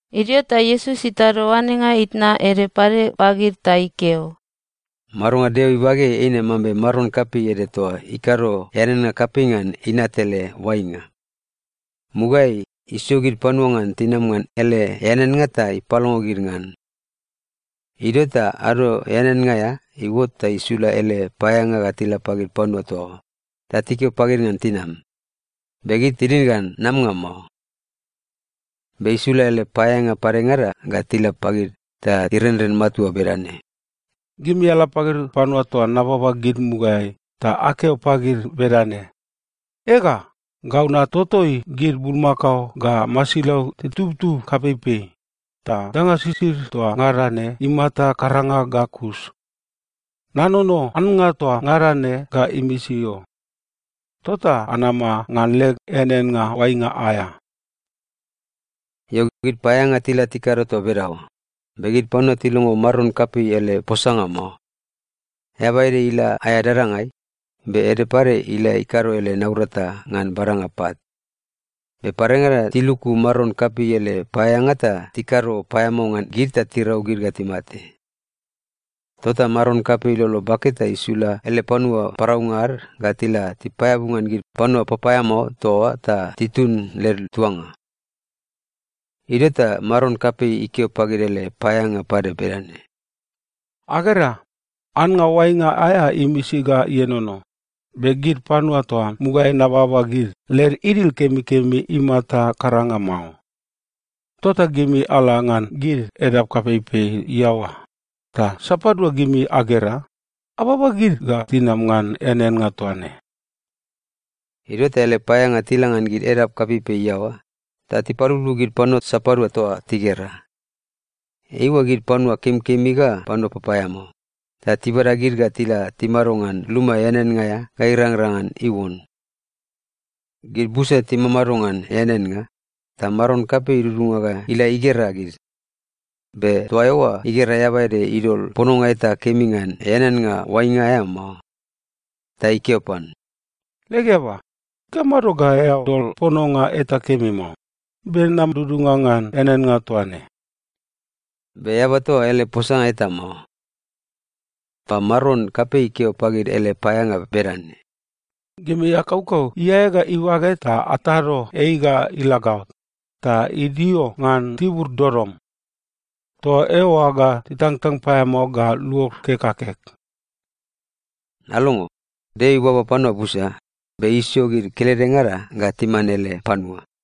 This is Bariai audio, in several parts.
Idio ta Iesus itado oanenga itna ede pade pagid ta ikeo, “Madonga Deo ibageai eine mambe maron kapei ede toa ikado eaneannga kapei ngan inat ele oainga. Mugaeai, isio gid panua ngan tinam ngan ele eaneannga ta ipalongo gid ngan. Idio ta ado eaneannga aea iuot ta isula ele paeaeanga ga tila pagid panua toa oa, ta tikeo pagid ngan tinam, be gid tinid ngan namanga mao. “Be isula ele paeaeanga padengada ga tila pagid ta irenren matua bedane, ‘Gimi ala pagid panua toa nababa gid mugaeai, ta akeo pagid bedane, “Ega, gau natotoi gid bulmakao ga masilau titubtub kapeipei, ta danga sisid toa ngada ne imata karanga ga kus. Nanono annga toa ngada ne ga imisi o. Tota anama ngan leg eaneannga oainga aea.” ’ “Io, gid paeaeanga tila tikado toa bedaoa, be gid panua tilongo maron kapei ele posanga mao. Eaba ede ila aea dadangai, be ede pade ila ikado ele naurata ngan badanga pat. Be padengada tiluku maron kapei ele paeaeanga ta tikado paeamao ngan gid ta tirau gid ga timate. Tota maron kapei ilolo bake ta isula ele panua paraunga ad ga tila tipaeabu ngan gid panua papaeamao toa oa ta titun led tuanga. “Idio ta maron kapei ikeo pagid ele paeaeanga pade bedane, ‘Agera, annga oainga aea imisi ga ienono, be gid panua toa mugaeai nababa gid, led idil kemikemi imata karanga mao. Tota gimi ala ngan gid edap kapeipei iaoa, ta sapadua gimi agera, ababa gid ga tinam ngan eaneannga toa ne.’ Idio ta ele paeaeanga tila ngan gid edap kapeipei iaoa, ta tipaluplup gid panua sapadua toa tigera. Eiua gid panua kemikemi ga panua papaeamao, ta tibada gid ga tila timado ngan luma eaneannga aea ga irangrang ngan iuon. “Gid busa timamado ngan eaneannga, ta maron kapei idudunga ga ila igera gid. Be toa eoa igera eaba ede idol pononga eta kemi ngan eaneannga oainga aea mao. Ta ikeo pan, ‘Leg eaba, ikamado ga eao dol pononga eta kemi mao, be nam dudunga ngan eaneannga toa ne?’ Be eaba toa oa ele posanga eta mao. “Ta maron kapei ikeo pagid ele paeaeanga bedane, ‘Gimi akaukau iae ga ibage ta atado ei ga ila gaot, ta idio ngan tibur dodom. Toa eoa ga titangtang paeamao ga luod kek ga kek.’ “Alongo. Deo ibaba panua busa, be isio gid keledengada ga timan ele panua.”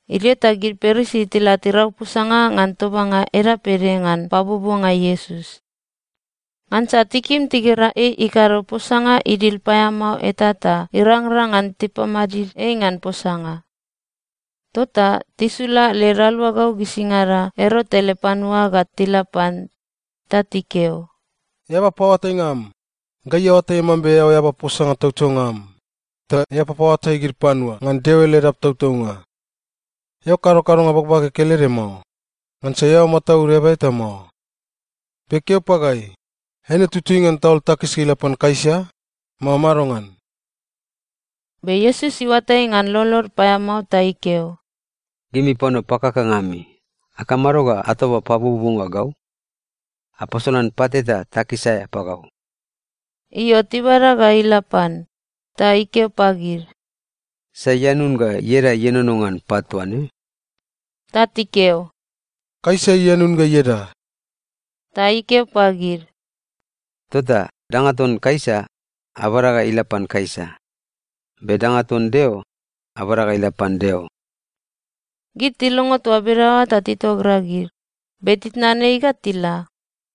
Idio ta gid Parisi tila tirau posanga ngan tobanga edap ede ngan pabuobuonga Iesus. Ngansa tikim tigera ei ikado posanga idil paeamao eta ta irangrang ngan tipamadid ei ngan posanga. Tota tisula led aluagau gisingada Erot ele panua ga tila pan. Ta tikeo, “Eaba paoatainga am, gai aoatai mambe eao eaba posanga tautaunga am, ta eao papaoatai gid panua ngan Deo ele edap tautaunga. Eao kado kadonga bagbage kelede mao, ngansa eao mataud eaba eta mao. Be keo pagai, eine tutui ngan taol takis ga ila pan Kaisa, mao madongan?” Be Iesus iuatai ngan lolod paeamao ta ikeo, “Gimi panua pakakanga ami! Akamado ga atoba pabuobuonga gau? Apasolan pat eta takis aea pagau.” Io, tibada ga ila pan, ta ikeo pagid, “Sai ianun ga ieda ienono ngan pat toa ne?” Ta tikeo, “Kaisa ianun ga ieda.” Ta ikeo pagid, “Tota danga ton Kaisa, abada ga ila pan Kaisa. Be danga ton Deo, abada ga ila pan Deo.” Gid tilongo toa bedaoa ta titogragid, be titnan ei ga tila.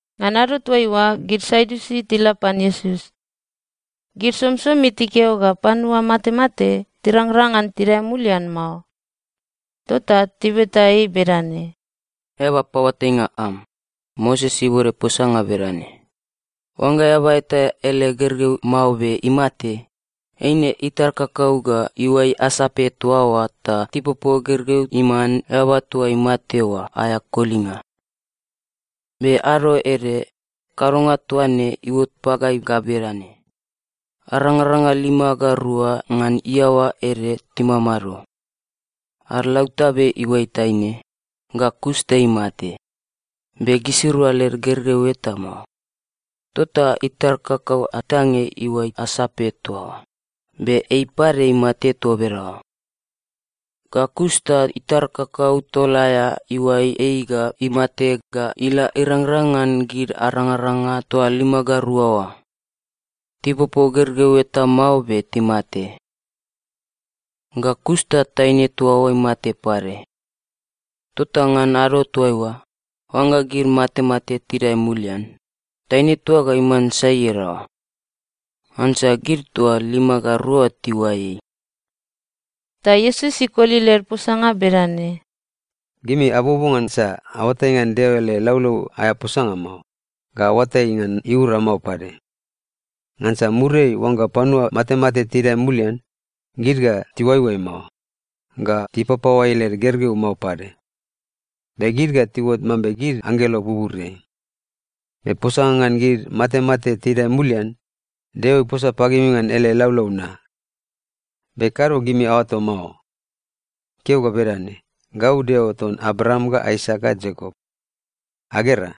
Ngan ado toaiua, gid Sadiusi tila pan Iesus. Gid somisomi tikeo ga panua matemate tirangrang ngan tidae mulian mao. Tota tibeta ei bedane, “Eaba paoatainga am, Moses ibode posanga bedane, ‘Oangga eaba eta ele gergeu mao be imate, eine itar kakau ga iuai asape toa oa ta tipopo gergeu iman eaba toa imate oa aea kolinga.’ Be ado ede, kadonga toa ne iuot pagai ga bedane: Arangaranga lima ga rua ngan iaoa ede timamado. Ad lautabe iuai taine, ga kus ta imate, be gisirua led gergeu eta mao. Tota itar kakau atange iuai asape toa oa, be ei pade imate toa bedaoa. Ga kus ta itar kakau tol aea iuai ei ga imate ga ila irangrang ngan gid arangaranga toa lima ga rua oa. Tipopo gergeu eta mao, be timate. Ga kus ta taine toa oa imate pade. Tota ngan ado toaiua, oangga gid matemate tidae mulian, taine toa oa ga iman sai iadaoa? Ngansa gid toa lima ga rua oa tiuai ei.” Ta Iesus ikoli led posanga bedane, “Gimi abuobuo ngansa aoatai ngan Deo ele laulau aea posanga mao, ga aoatai ngan iura mao pade. Ngansa muriai, oangga panua matemate tidae mulian, gid ga tiuaioai mao, ga tipapaoai led gergeu mao pade. Be gid ga tiuot mambe gid anggelo buburiai. Be posanga ngan gid matemate tidae mulian, Deo iposa pagimi ngan ele laulau na. Be kado gimi aoato mao? Ikeo ga bedane, ‘Gau Deo ton Abraam ga Aisak ga Iakop.’ Agera,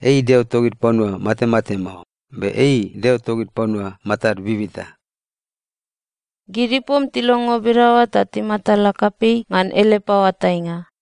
ei Deo togid panua matemate mao, be ei Deo togid panua matad bibita.” Gid ipom tilongo bedaoa ta timatala kapei ngan ele paoatainga.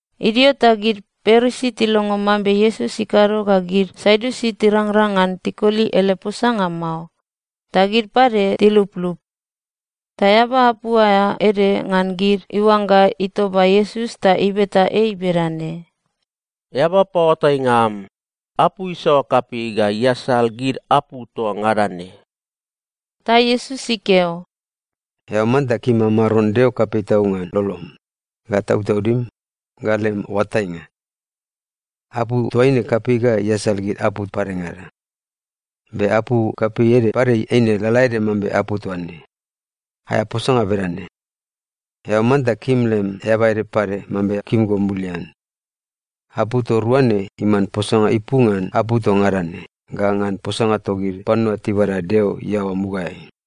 Idio ta gid Parisi tilongo mambe Iesus ikado ga gid Sadiusi tirangrang ngan tikoli ele posanga mao, ta gid pade tiluplup. Ta eaba apu aea ede ngan gid iuangga itoba Iesus ta ibeta ei bedane, “Eaba paoatainga am, apu isaoa kapei ga iasal gid apu toa ngada ne?” Ta Iesus ikeo, “‘Eao manta kim am Maron Deo kapei tau ngan lolom, ga tautaudim, ga lem oatainga.’ Apu toaine kapei ga iasal gid apu padengada. Be apu kapei ede pade eine lalaede mambe apu toa ne. Aea posanga bedane, ‘Eao manta kim lem eaba ede pade mambe kim go mulian.’ Apu toa rua ne iman posanga ipu ngan apu toa ngada ne ga ngan posanga togid panua tibada Deo iaoa mugaeai.”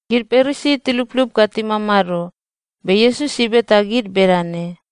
Gid Parisi tiluplup ga timamado, be Iesus ibeta gid bedane,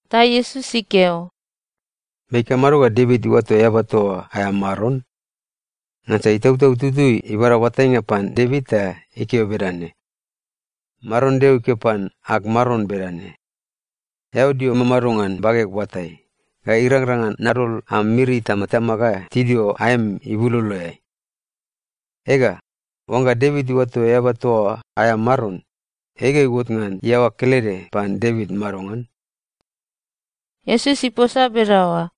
Ta Iesus ikeo, “Be ikamado ga Devit iuato eaba toa oa aea Maron? Ngansa Itautau Tutui ibada oatainga pan Devit ta ikeo bedane, “‘Maron Deo ikeo pan ag Maron bedane, “Eao dio mamado ngan bageg oatai, ga irangrang ngan nadol am miri itamatama ga tidio aem ibuloloeai.” ’ Ega, oangga Devit iuato eaba toa oa aea Maron, ei ga iuot ngan iaoa kelede pan Devit madongan?” Iesus iposa bedaoa,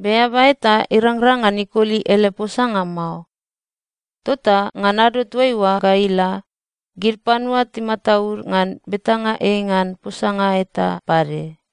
be eaba eta irangrang ngan ikoli ele posanga mao. Tota ngan ado toaiua ga ila, gid panua timataud ngan betanga ei ngan posanga eta pade.